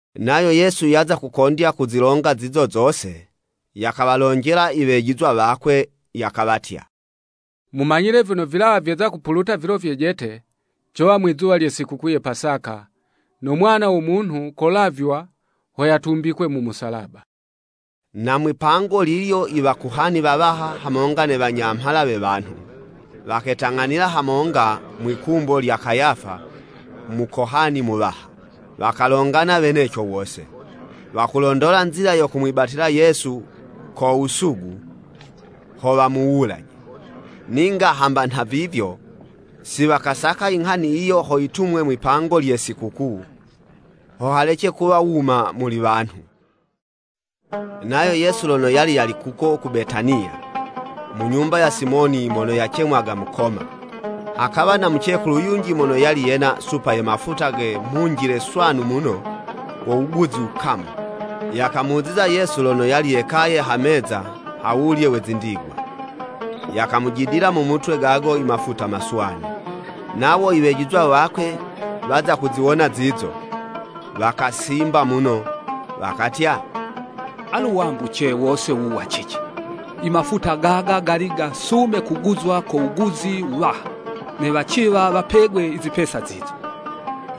Nayo Yesu yaza kukondya kuzilonga zizo zose, yakawalonjela iwejizwa wakwe, yakawatya, “Mumanyile vyono, vilawa vyeza kupuluta vilo vyejete cowa mwizuwa lye sikukuu ya Pasaka, no Mwana wo Munhu kolavywa ho yatumbikwe mu musalaba.” Na mwi'pango lilyo i Wakohani wawaha hamonga ne wanyamhala we wanhu, waketang'anila hamonga mwi'kumbo lya Kayafa, Mukohani Muwaha. Wakalongana weneco wose, wakulondola nzila yo kumwibatila Yesu ko wusugu, ho wamuwulaje. Ninga hamba nha vivyo, si wakasaka inghani yiyo ho yitumwe mwi'pango lye Sikukuu, ho halece kuwa wuma muli wanhu. Nayo Yesu lono yali yali kuko ku Betaniya, mu nyumba ya Simoni mono kacemwaga Mukoma, hakawa na mucekulu yunji mono yali yena supa ye mafuta ge mhunjile swanu muno go wuguzi wukamu, yakamuziza Yesu lono yali yekaye ha meza ha wulye we zindigwa, yakamujidila mu mutwe gago i mafuta maswanu. Nawo i wejizwa wakwe waza kuziwona zizo, wakasimba muno wakatya, “Alu wambuce wose wuwu wa cici?” Imafuta gaga, gali gasume kuguzwa ko wuguzi wuwaha, ne waciwa wapegwe izipesa zizo.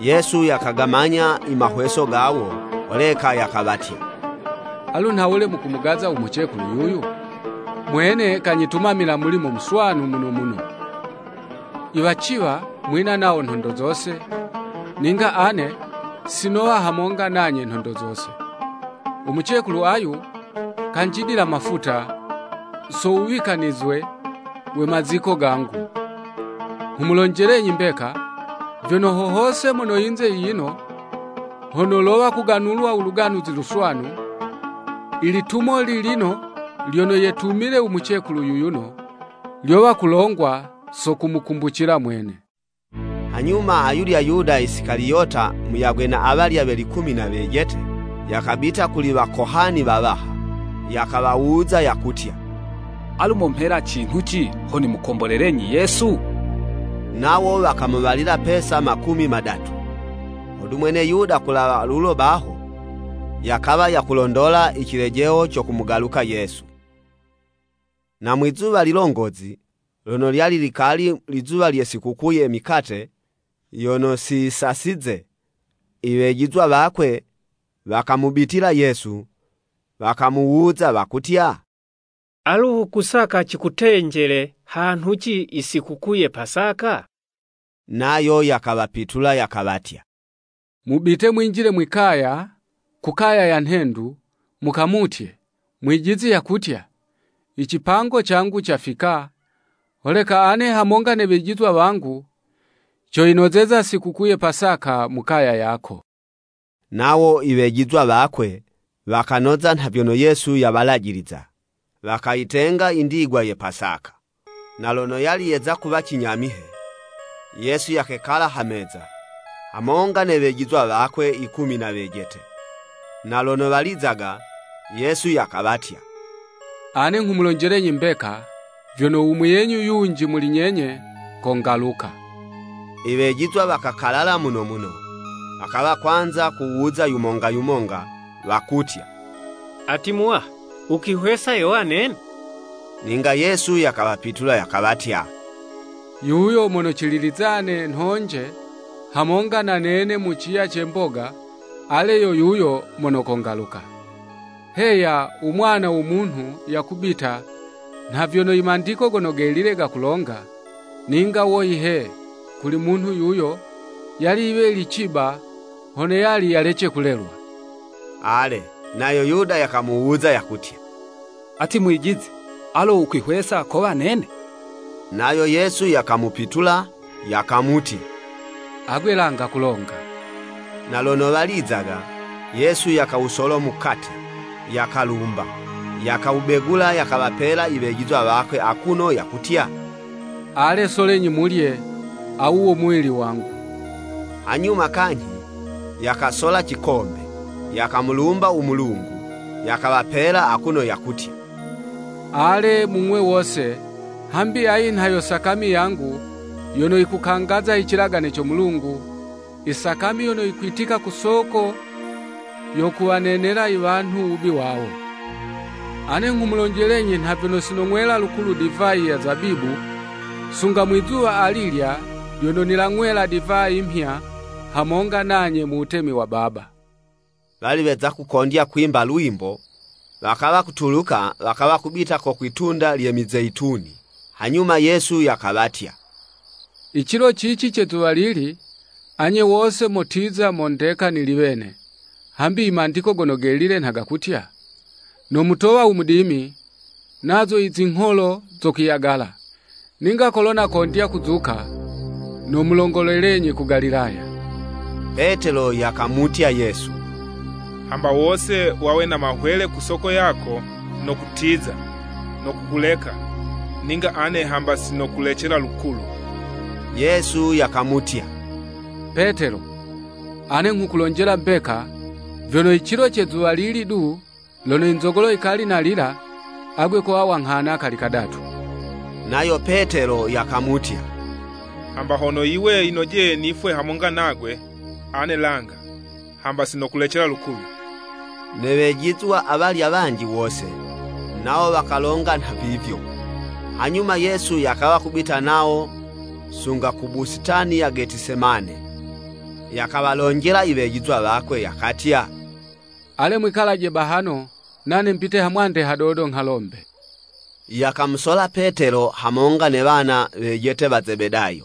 Yesu yakagamanya i mahweso gawo, holeka yakawatya, “Alu nhawule mukumugaza u mucekulu yuyu? Mwene kanyitumamila mulimo muswanu muno muno. Iwaciwa mwina nawo nhondo zose, ninga ane si nowa hamonga nanye nhondo zose. U mucekulu ayu, kanjidila mafuta, so wuwikanizwe we maziko gangu. Nghumulonjelenyi mbeka, vyono ho hose mono yinze yiyino, hono lowa kuganulwa u Luganuzi Luswanu, ilitumo lilino lyono yetumile u mucekulu yuyuno, lyowa kulongwa so kumukumbucila mwene.” Hanyuma ayulya Yuda Isikaliyota muyagwe na awalya we likumi na wejete, yakabita kuli Wakohani wawaha, yakawawuza yakutya, “Alu momhela cinhuci ho nimukombolelenyi Yesu?” Nawo wakamuwalila pesa makumi madatu, hodu mwene Yuda kulawa lulo baho, yakawa yakulondola icilejeho co kumugaluka Yesu. Na mwizuwa lilongozi, lono lyali likali lizuwa lye sikukuu ye mikate yono siyisasize, iwejizwa wakwe, wakamubitila Yesu, wakamuwuza wakutya, “Alo wukusaka cikutenjele hanhuci i sikukuu ye Pasaka?” Nayo yakawapitula yakawatya, “Mubite mwinjile mwi'kaya, ku kaya ya nhendu, mukamutye, Mwijizi yakutya, icipango cangu cafika, holeka ane hamonga ne wejizwa wangu, coyinozeza sikukuu ye Pasaka mu kaya yako.” Nawo i wejizwa wakwe, wakanoza nha vyono Yesu yawalajiliza, wakayitenga i ndigwa ye Pasaka. Na lono yali yeza kuwa cinyamihe, Yesu yakekala ha meza, hamonga ne wejizwa wakwe yikumi na wejete. Na lono walizaga, Yesu yakawatya, “Ane nghumulonjelenyi mbeka, vyono u muyenyu yunji muli nyenye, kongaluka.” Iwejizwa wakakalala muno muno, wakawa kwanza kuwuza yumonga yumonga wakutya “Ati, Muwaha, wukwihwesa yowa nene?” Ninga Yesu yakawapitula yakawatya, “Yuyo mono cililizane nhonje hamonga na nene mu ciya ce mboga, ale yo yuyo mono kongaluka. Heya u Mwana wo Munhu yakubita, nha vyono i Mandiko Gono Gelile gakulonga, ninga woyi he, kuli munhu yuyo, yali yiwe yili ciba hono yali yalece kulelwa.” Ale, nayo Yuda yakamuwuza, yakutya, “Ati Mwijizi, alo wukwihwesa kowa nene?” Nayo Yesu yakamupitula yakamutya, “Agwe langa kulonga.” Na lono walizaga, Yesu yakawusola mukate, yakalumba, yakawubegula, yakawapela iwejizwa wakwe akuno yakutya, “Ale solenyi mulye, awu wo muwili wangu.” Hanyuma kanyhi, yakasola cikombe, yakamulumba u Mulungu, yakawapela, akuno yakutya, “Ale, mung'we wose, hambi ayi nha yo sakami yangu yono yikukangaza i cilagane co Mulungu, isakami yono yikwitika ku soko yo kuwanenela i wanhu wubi wawo. Ane nghumulonjelenyi nha vyono si nong'wela lukulu divayi ya zabibu, sunga mwi'zuwa alilya lyono nilang'wela divayi 'mhya hamonga nanye mu Wutemi wa Baba.” Wali weza kukondya kwimba lwimbo, wakawa kutuluka wakawa kubita ku kwi'tunda lye Mizeyituni. Hanyuma Yesu yakawatya, “Icilo cici ce zuwalili, anye wose motiza mondeka nili wene, hambi i Mandiko Gono Gelile nha gakutya, ‘Nomutowa u mudimi, Nazo izingholo zokwiyagala.’ Ninga kolo nakondya kuzuka, nomulongolelenyi ku Galilaya.” Petelo yakamutya Yesu, “Hamba wose wawe na mahwele ku soko yako, no kutiza, no kukuleka, ninga ane hamba si nokulecela lukulu.” Yesu yakamutya “Petelo, ane nghukulonjela mbeka, vyono i cilo ce zuwalili du, lono i nzogolo yikali nalila, agwe kowa wanghana kali kadatu.” Nayo Petelo yakamutya, “Hamba hono yiwe yinojeye nifwe hamonga nagwe, ane langa, hamba si nokulecela lukulu.” Ne wejizwa awalya wanji wose, nawo wakalonga nhavivyo. Hanyuma Yesu yakawa kubita nawo sunga ku busitani ya Getisemane, yakawalonjela iwejizwa wakwe yakatya, “Ale mwikalaje bahano, nane mbite hamwande hadodo nghalombe.” Yakamusola Petelo hamonga ne wana wejete wa Zebedayo,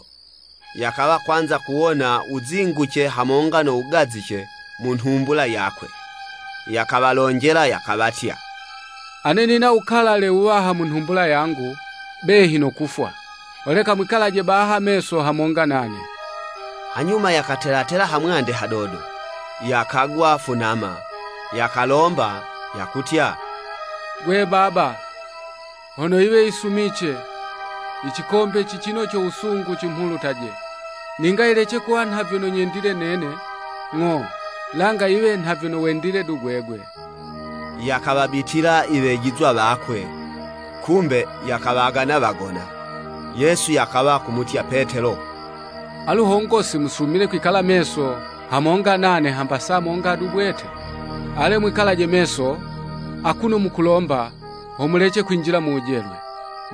yakawa kwanza kuwona wuzinguce hamonga no wugazice mu nhumbula yakwe. Yakawalonjela yakawatya, “Ane nina wukalale wuwaha mu nhumbula yangu, behi no kufwa. Holeka mwikalaje baha meso hamonga nane.” Hanyuma yakatela tela hamwande hadodo, yakagwa funama, yakalomba, yakutya, “Gwe Baba, hono yiwe yisumice, icikombe cicino co wusungu cimhulutaje, ninga yilece kuwa nha vyono nyendile nene, ng'o, langa yiwe nha vyono wendile du gwegwe.” Yakawabitila i wejizwa wakwe, kumbe, yakawagana wagona. Yesu yakawa kumutya Petelo, “Alu hongo si musumile kwikala meso hamonga nane hamba saa monga du bwete? Ale mwikalaje meso akuno mukulomba ho mulece kwinjila mu wujelwe.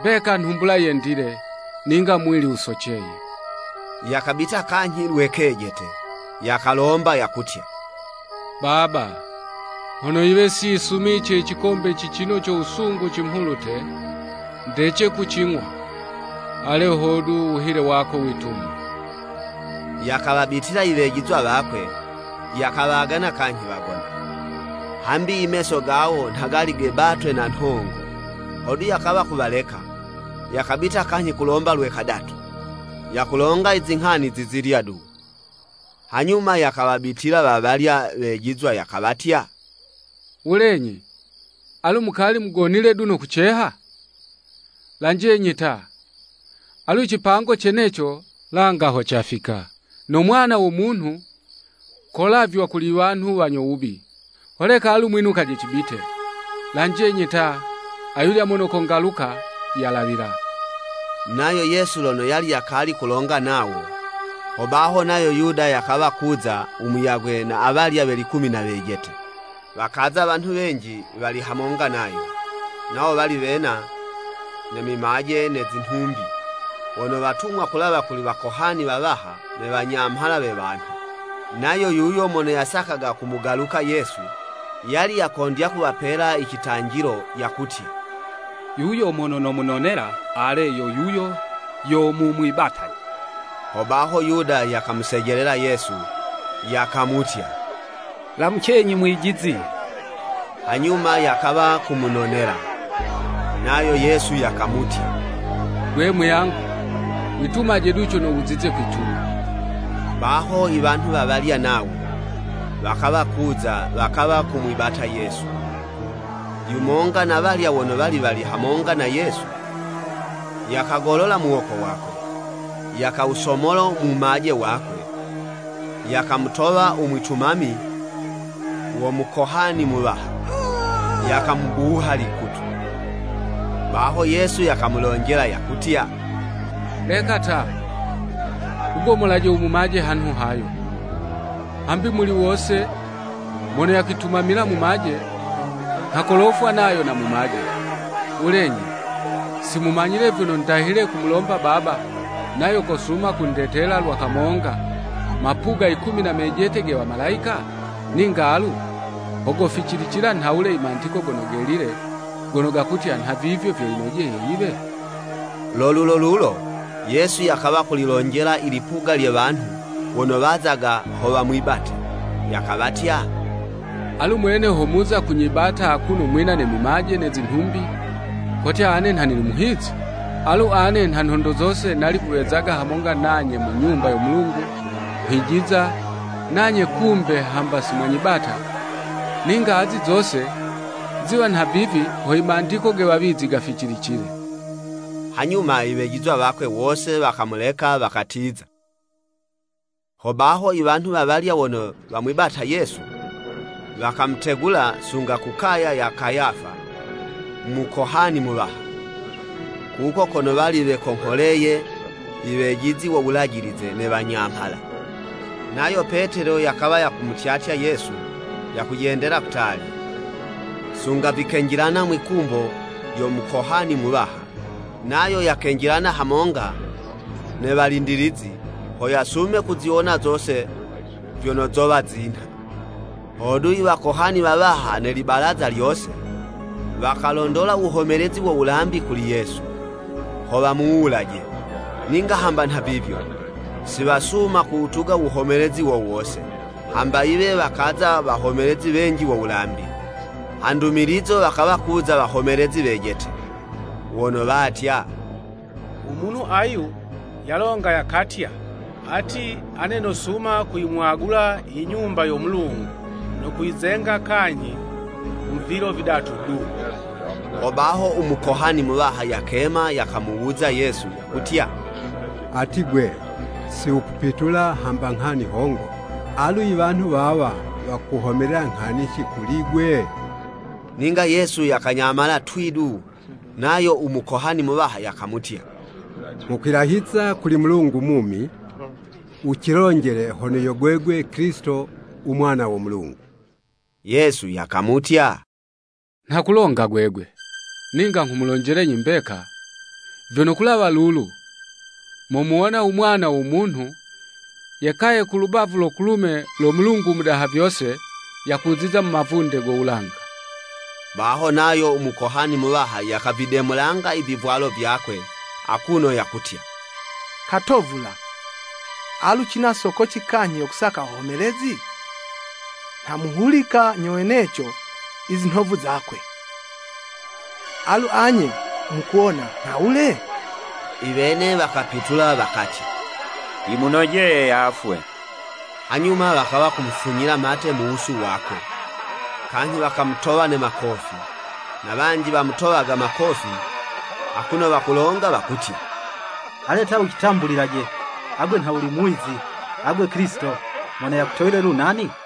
Mbeka nhumbula yendile ninga muwili wusoceye.” Yakabita kanyhi lwe kejete, yakalomba yakutya, “Baba, hono yiwe si yisumice icikombe cicino co wusungu cimhulute ndece kucig'wa, ale, hodu, u wuhile wako witumwe.” Yakawabitila iwejizwa wakwe, yakawagana kanyhi wagona, hambi i meso gawo nha gali gebatwe na nhongo. Hodu, yakawa kuwaleka, yakabita kanyhi, kulomba lwe kadatu, yakulonga izinghani zizilya du. Hanyuma yakawabitila wawalya wejizwa yakawatya, “Wulenyi, alu mukali mugonile du no kuceha? Lanjenyi ta! Alu icipango ceneco langa ho cafika, no Mwana wo Munhu kolavywa kuli i wanhu wanyo wubi. Holeka alu mwinukaje cibite. Lanjenyi ta, ayulya mono kongaluka yalawila.” Nayo Yesu lono yali yakali kulonga nawo, hobaho nayo Yuda yakawa kuza u muyagwe na awalya we likumi na wejete. Wakaza wanhu wenji wali hamonga nayo, nawo wali wena, ne mimaje ne zinhumbi, wono watumwa kulawa kuli wakohani wawaha ne wanyamhala we wanhu. Nayo yuyo mono yasakaga kumugaluka Yesu, yali yakondya kuwapela icitanjilo yakutya, “Yuyo mono nomunonela, ale, yo yuyo, yo mumwibataje.” Hobaho Yuda yakamusejelela Yesu, yakamutya, “Lamucenyi, Mwijizi!” Hanyuma yakawa kumunonela. Nayo Yesu yakamutya, “Gwe muyangu, witumaje du cono wuzize kwituma.” Baho i wanhu wawalya nawo, wakawa kuza wakawa kumwibata Yesu. Yumonga na'walya wono wali wali hamonga na Yesu, yakagolola muwoko wakwe, yakawusomola mumaje wakwe, yakamutowa u mwitumami wo Mukohani Muwaha, yakamubuha likutu. Baho Yesu yakamulonjela yakutya, “Leka ta, wugomolaje u mumaje hanhu hayo, hambi muli wose mono yakwitumamila mumaje nha kolofwa nayo na mumaje. Wulenyi, si mumanyile vyono ndahile kumulomba Baba, nayo kosuma kundetela lwa kamonga, mapuga yikumi na mejete ge wamalayika? Ninga alu, ho goficilicila nhawule i Mandiko Gono Gelile, gono gakutya, nhavivyo vyo yinojeye yiwe?” Lo lulo lulo, Yesu yakawa kulilonjela ilipuga lye wanhu wono wazaga ho wamwibate, yakawatya, “Alu mwene ho muza kunyibata akuno mwina ne mimaje ne zinhumbi, kotya ane nha nili muhizi? Alu ane, nha nhondo zose nali kuwezaga hamonga nanye mu Nyumba yo Mulungu nghwijiza, nanye kumbe hamba si mwanyibata! Ninga azi zose ziwa nhavivi, ho i Mandiko ge wawizi gaficilicile.” Hanyuma iwejizwa wakwe wose wakamuleka wakatiza. Hobaho, iwanhu wawalya wono wamwibata Yesu, wakamutegula sunga ku kaya ya Kayafa, Mukohani Muwaha, kuko kono wali wekongholeye i wejizi wo Wulajilize ne Wanyamhala. Nayo Petelo yakawa yakumutyatya Yesu yakujendela kutali, sunga vikenjilana mwi'kumbo lyo Mukohani Muwaha, nayo yakenjilana hamonga ne walindilizi, ho yasume kuziwona zose vyono zowa zinha. Hodu, i Wakohani wawaha ne libalaza lyose, wakalondola wuhomelezi wo wulambi kuli Yesu, ho wamuwulaje, ninga hamba nha vivyo, si wasuma kuwutuga wuhomelezi wo wose, hamba yiwe wakaza wahomelezi wenji wo wulambi. Ha ndumilizo wakawa kuza wahomelezi wejete, wono watya, “U munhu ayu, yalonga yakatya, ati, ‘Ane nosuma kuyimwagula i Nyumba yo Mulungu, no kuyizenga kanyhi mu vilo vidatu du.'" Hobaho u Mukohani Muwaha yakema yakamuwuza Yesu yakutya, “Ati 'gwe, si wukupitula hamba nghani hongo? Alu i wanhu wawa wakuhomelela nghanici kuli'gwe?” Ninga Yesu yakanyamala twii du. Nayo u Mukohani Muwaha yakamutya, “Nghukwilahiza kuli u Mulungu mumi, wucilonjelaje hono yo gwegwe Kilisito u Mwana wo Mulungu!” Yesu yakamutya, “Nha kulonga gwegwe! Ninga nghumulonjelenyi mbeka, vyono kulawa lulu momuwona u Mwana wo Munhu yekaye ku lubavu lo kulume lo Mulungu u Mudaha vyose, yakuziza mu mavunde go wulanga.” Baho nayo Mukohani Muwaha yakavidemulanga i vivwalo vyakwe akuno yakutya, “Katovula! Alu cina sokoci kanyhi yo kusaka wahomelezi? Nha muhulika nyo weneco i zinhovu zakwe. Alu anye, mukuwona nhawule?” Iwene wakapitula wakatya, “Yimunojeye yafwe!” Hanyuma wakawa kumufunyila mate mu wusu wakwe, kanyhi wakamutowa ne makofi. Na wanji wamutowaga makofi, akuno wakulonga wakutya, “Ale ta wucitambulilaje, agwe nha wuli muwizi, agwe Kilisito, mono yakutowile lu nani?”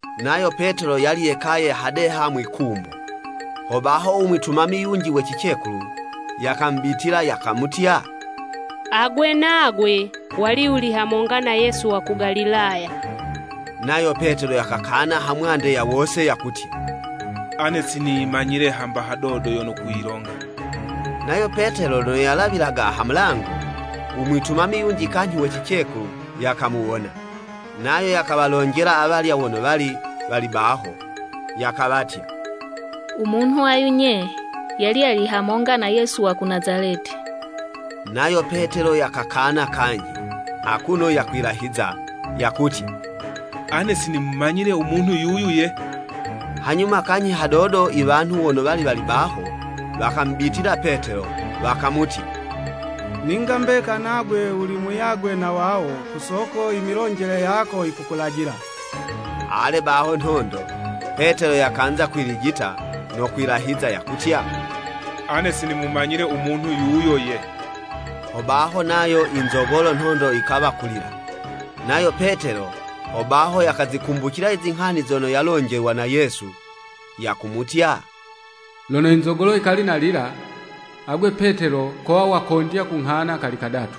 Nayo Petelo yali yekaye hadeha mwi'kumbo. Hobaho u mwitumami yunji we cicekulu, yakamubitila, yakamutya, “Agwe nagwe wali wuli hamonga na Yesu wa ku Galilaya.” Nayo Petelo yakakana ha mwande ya wose yakutya, “Ane si niyimanyile hamba hadodo yono wukuyilonga.” Nayo Petelo lono yalawilaga ha mulango, u mwitumami yunji kanyhi we cicekulu yakamuwona, nayo yakawalonjela awalya wono wali wali baho, yakawatya, “U munhu ayu nye, yali yali hamonga na Yesu wa ku Nazaleti.” Nayo Petelo yakakana kanyhi, akuno yakwilahiza, yakutya, “Ane si nimumanyile u munhu yuyu ye!” Hanyuma kanyhi hadodo iwanhu wono wali wali baho, wakamubitila Petelo, wakamutya, “Ninga mbeka nagwe wuli muyagwe na wawo, ku soko imilonjele yako yikukulajila.” Ale baho nhondo, Petelo yakanza kwilijita no kwilahiza, yakutya, “Ane si nimumanyile u munhu yuyo ye.” Hobaho nayo inzogolo nhondo yikawa kulila. Nayo Petelo, hobaho yakazikumbucila izinghani zono yalonjelwa na Yesu yakumutya, “Lono inzogolo yikali nalila, agwe Petelo kowa wakondya kunghana kali kadatu.”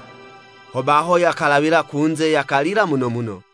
Hobaho yakalawila kunze yakalila muno muno.